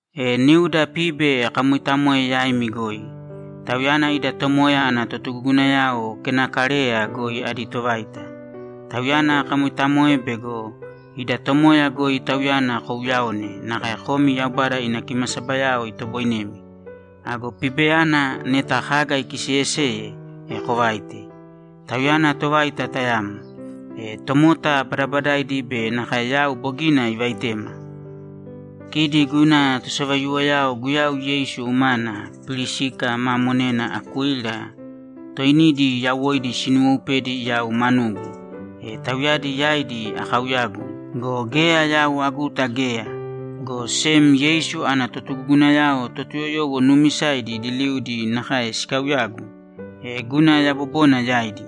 E niuda Pibe akamoitamoe yaimi goi; tauyana ida Tomoya ana totugugunayao Kenakareya goi adi tovaita. Tauyana akamoitamoe bego ida Tomoya goi tauyana kouyaone nakae komi Yaubada ina kimasabayao itoboinemi. Ago Pibeyana neta kaga ikiseyeseye, e kovāite. Tauyana tovaita tayamo; e tomota badabadaidi be nakae yau bogina ivaitema. Kidi guna tosavaiyuwoyao Guyau Yeisu umana Pirisika ma monena Akuila toinidi yawoidi sinuwoupedi yau manugu, e tauyadi yaidi akauyagu go, geya yau aguta geya, go sem Yeisu ana totugugunayao Totuyoyowo nuumisaidi liliudi nakae sikauyagu, e guna yabobona yaidi.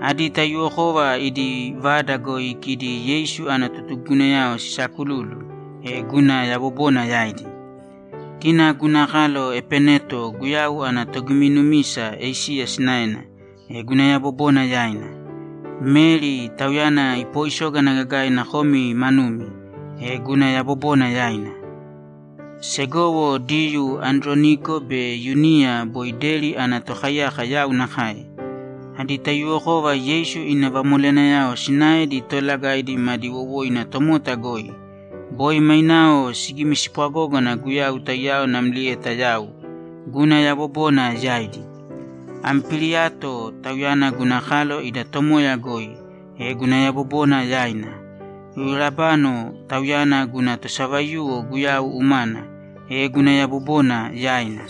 Adi taiyuwokova idi vada goi kidi Yeisu ana totugugunayao sisaakululu, e guna yabobona yaidi. Kina guna kalo Epeneto Guyau ana togiminumisa Esiya sinaena, e guna yabobona yaina. Meri, tauyana ipooisógana gagaina komi manumi, e guna yabobona yaina. Segowo Diyuu Androniko be Yuniya boi deri ana tokaiyaka yau nakae. Adi taiyuwokova Yeisu ina vamoleyanayao sinaedi toolagaidi madi wowoina tomota goi. Boi mainao sigimispwagógana Guyau taiyao namlieta yau. Guna yabobona yaidi. Ampiliato, tauyana guna kalo ida Tomoya goi, e guna yabobona yaina. Urabano, tauyana guna tosavaiyuwo Guyau umana, e guna yabobona yaina.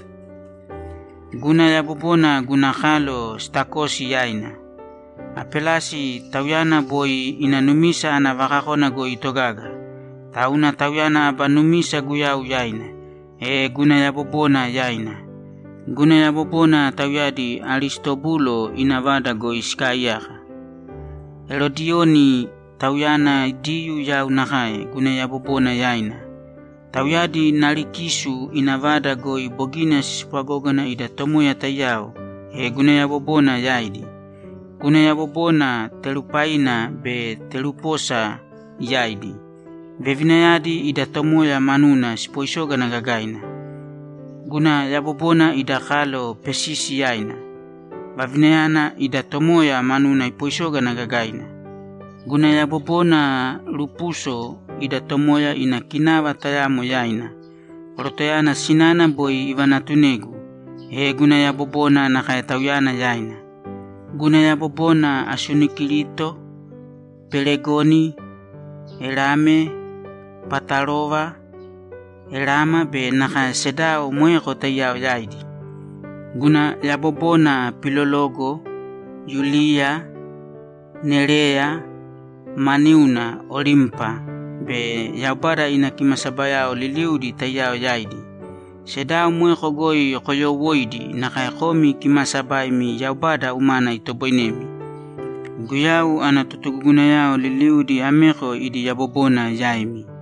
Guna yabobona guna kalo Stakosi yaina. Apelasi, tauyana boi ina numisa ana vakakona goi itogaga, tauna tauyana aba numisa Guyau yaina, e guna yabobona yaina. Guna yabobona tauyadi Aristobulo ina vada goi sikaaiyaka. Erodiyoni, tauyana Diyuu yau nakae, guna yabobona yaina. Tauyadi Narikisu ina vada goi bogina sispwagógana ida Tomoya taiyao, e guna yabobona yaidi. Guna yabobona Terupaina be Teruposa yaidi. Vevinayadi ida Tomoya manuna sipoisógana gagaina. Guna yabobona ida kalo Pesisi yaina. Vavinayana ida Tomoya manuna ipoisógana gagaina. Guna yabobona Rupuso ida Tomoya ina kinava tayamo yaina. Korotoyana sinana boi ivanatunegu, e guna yabobona nakae tauyana yaina. Guna yabobona Asunikirito, Pelegoni, Erame, Patarova, Erama be nakae sedao moeko taiyao yaidi. Guna yabobona Pilologo, Yuliya, Nereya ma niuna, Olimpa be Yaubada ina kimasabayao liliudi taiyao yaidi. Sedao moeko goi koyoowoiīdi nakae komi kimaasabaimi Yaubada umana itoboinemi. Guyau ana totugugunayao liliudi ameko idi yabobona yaimi.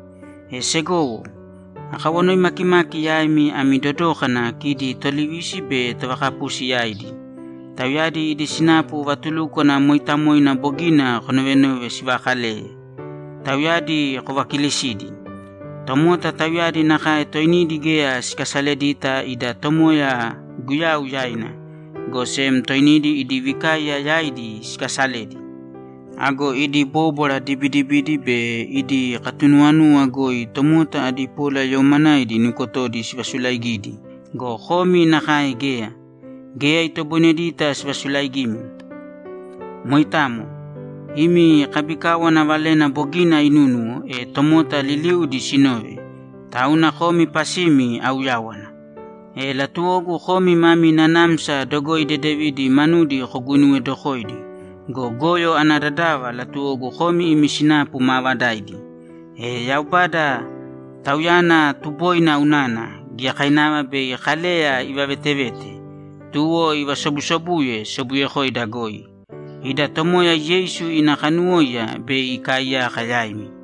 E segowo, akawanoi makimaki yaimi ami dodōkana kidi tolivisi be tovakapusi yaidi. Tauyadi idi sinapu vatulúkwana mooitamoina bogina konovenove sivakaleye. Tauyadi kovakilisīdi. Tomota tauyadi nakae toinidi geya sikasaledita ida Tomoya Guyau yaina, go sem toinidi idi vikaiya yaidi sikaasaledi. Ago idi bóbwara dibidibidi be idi katunuwanuwa goi tomota adi polayoomanaidi nukotodi sivasulaigidi go, komi nakae geya. Geya itoboinedita sivasulaigimi. Moitamo. Imi kabikáwana valena bogina inúnuwo, e tomota liliudi sinove, tauna komi pasimi auyáwana. E latuwogu komi mami nanamsa dogoi dedevidi manudi koguinuwedokoidi go, goyo ana dadava latuwogu komi imi sinapu maavadaidi. E Yaubada, Tauyana tuboina unana, giyakainava bei Kaleya ivavetevete, tuwo ivasobusobuye sobuyekoida goi. Ida Tomoya Yeisu ina kanuwóiya bei ikaaiyaka yaimi.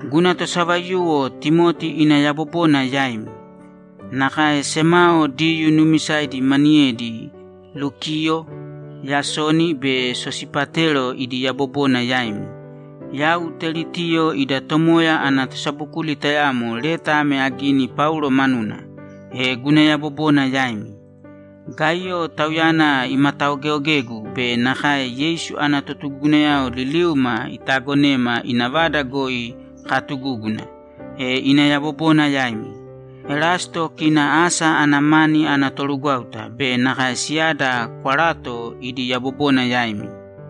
Guna tosavaiyuwo Timoti ina yabobona yaimi. Nakae semao Diyuu nuumisaidi maniyedi Lukiyo, Yasoni be Sosipatero idi yabobona yaimi. Yau Teritiyo ida Tomoya ana tosabokuli tayamo leta ame agini Paulo manuna, e guna yabobona yaimi. Gaiyo, tauyana imataogeeogegu be nakae Yeisu ana totugugunayao liliuma itaagonema ina vada goi katugúguna, e ina yabobona yaimi. Erasto kina asa ana mani ana torugwáuta be nakae siyada Kwarato idi yabobona yaimi.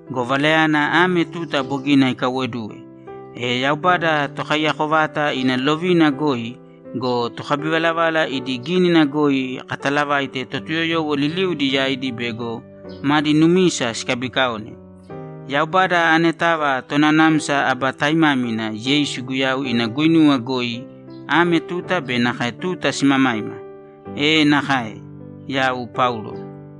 Go Valayana ame tuta bogina ikaiwoduwe, e Yaubada Tokaiyako vata ina lovina goi go, tokabivalavala idi gínina goi katalavaite Totuyoyowo liliudi yaidi bego madi numisa sikabikaone. Yaubada anetava Tonanamsa aba taimámina Yeisu Guyau ina guinuwa goi ame tuta be nakae tuta simamaima! E nakae! Yau Paulo